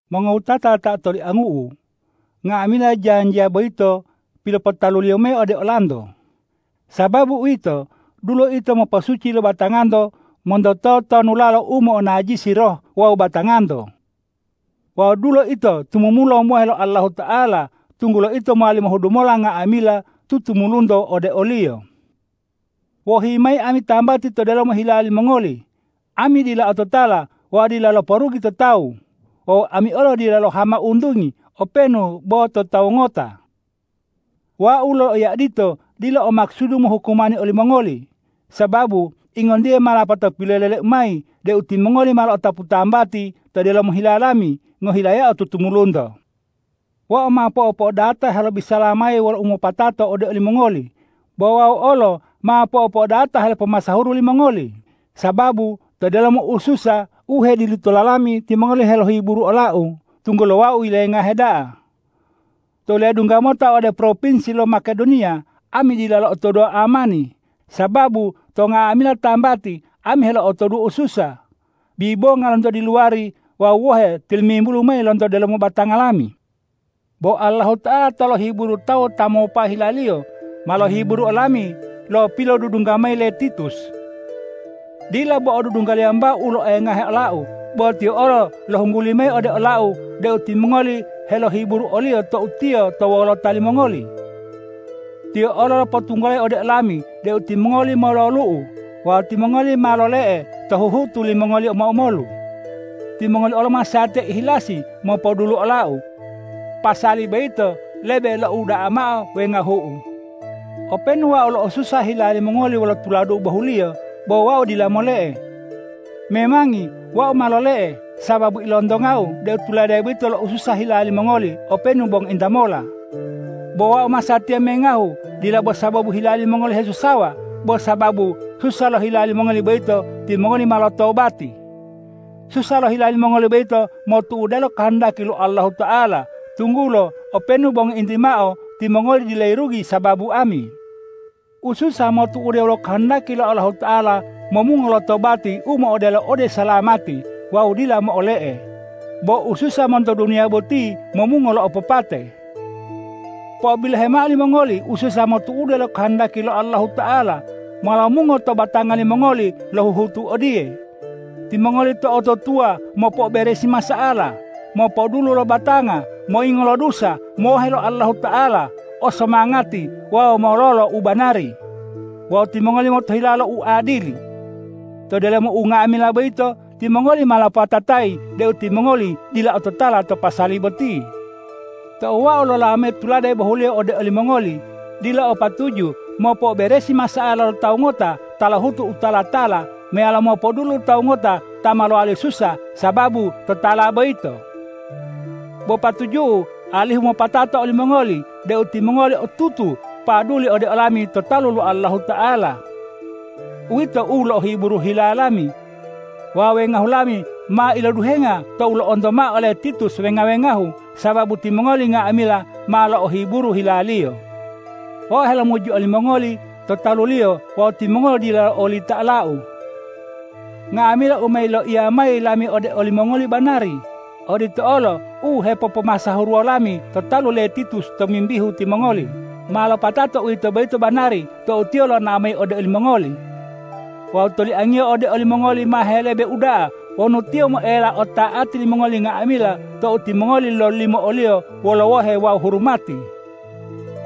Mongowutata ta otoliangu'u, nga'amila janjiya boyito pilopotaluliyo mayi ode olanto. Sababu uwito, dulo ito moposuci lo batanganto monto totonulalo u mo'onajisi roh wawu batanganto. Wawu dulo ito tumumula mohe lo Allahuta'ala, tunggulo ito mowali mohudu mola nga'amila tutumulunto ode o-Liyo. Wohi mayi ami tambati to delomo hila limongoli! Ami dila ototala wawu dila loporugi to tawu. Wawu ami olo dila lohama untungi openu bo to tawu ngota. Wau loloiya odito dila o makusudu mohukumani olimongoli, sababu ingontiye ma lapato piloleleu mayi deu timongoli ma lo'otapu tambati to delomo hila lami, ngohilayao tutumulunto. Wau ma po'opo'odata helobisala mayi wolo umopatato ode olimongoli, bo wau olo ma po'opo'odata helopomasahuru limongoli, sababu to delomo ususa u hedilutola lami timongoli helohiburu olau, tunggulo wau yilengahe da'a. Tou ledungga mota ode propinsi lo Makedoniya, ami dila lo'otoduwo uamani, sababu to nga'amila tambati ami helo'otoduwo ususa, bibonga lonto diluwari wawu wohe tilimimbulu mayi lonto delomo batanga lami. Bo Allahuta'ala ta lohiburu tawu ta mopa hilaliyo, ma lohiburu olami lo pilodudungga mayi le Titus. Dila bo odudunggaliyo wambao u loengahe olau, bo tiyo olo lohungguli mayi ode olau deu timongoli helohiburu oliyo tou tiyo to wolota limongoli. Tiyo olo lopotunggulayi ode olami deu timongoli mololu'u wawu timongoli ma lole'e to huhutu limongoli omo-omolu. Timongoli olo masatiya ihilasi mopodulu olau. Pasali boyito lebe lo'ouda'a mao wengahu'u. Openu wau lo'osusa hila limongoli wolo tuladu'u bohuliyo, bo wau dila mole'e. Memangi wau ma lole'e, sababu ilontongau deu tulade boyito lo'osusa hila limongoli openu bo ngointa mola. Bo wau masatiya mengahu, dila bo sababu hila limongoli hesusawa, bo sababu susa lo hila limongoli boyito timongoli ma lotobati. Susa lo hila limongoli boyito motu'ude lo kohondaki lo Allahuta'ala, tunggulo openu bo ngointi mao timongoli dila yirugi sababu ami. Ususa motu'ude wolo kohondaki lo Allahuta'ala momungo lotobati u mo'odelo ode usalamati wawu u dila mo'ole'e. Bo ususa monto duniya boti momungo lo opopate. Po'obilohe mao limongoli, ususa motu'ude lo kohondaki lo Allahuta'ala, ma lomungo to batanga limongoli lo huhutu odiye: Timongoli to'otutuwa mopo'oberesi masa'ala, mopodulu lo batanga, moyingo lo dusa, mohe lo Allahuta'ala, o somangati wawu mololo u banari. Wawu timongoli motohilawo lo uadili. To delomo unga'amila boyito timongoli ma lopopatatayi deu timongoli dila ototala to pasali boti. Tou wau lolawo mayi tulade bohuliyo ode olimongoli, dila o patuju mopo'oberesi masa'ala lo tawu ngota ta lohutu u tala-tala meyalo mopodulu tawu ngota ta ma lowali susa sababu totala boyito. Bo patuju'u alihu mopatata olimongoli deu timongoli otutu paduli ode olami to talu lo Allahuta'ala. Uwito u lo'ohiburu hila lami. Wawu wengahu lami ma iloduhenga tou lo'onto mao ole Titus wenga-wengahu, sababu timongoli nga'amila ma lo'ohiburu hilaliyo. Wau helomuji olimongoli to taluliyo wawu timongoli dila lo'olita olau. Nga'amila u ma yiloiya mayi lami ode olimongoli banari. Odito olo u hepopomasahuruwo lami to talu le Titus tomimbihu timongoli, ma lopatato uwito boyito banari tou tiyo lonao mayi ode olimongoli. Wawu toliangiyo ode olimongoli ma helebe uda'a wonu tiyo moela ota'ati limongoli nga'amila tou timongoli lololimo oliyo wolo wohe wawu hurumati.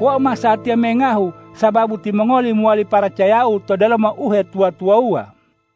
Wau masatiya mengahu, sababu timongoli mowali paracayau to delomo uhetuwa-tuwawuwa.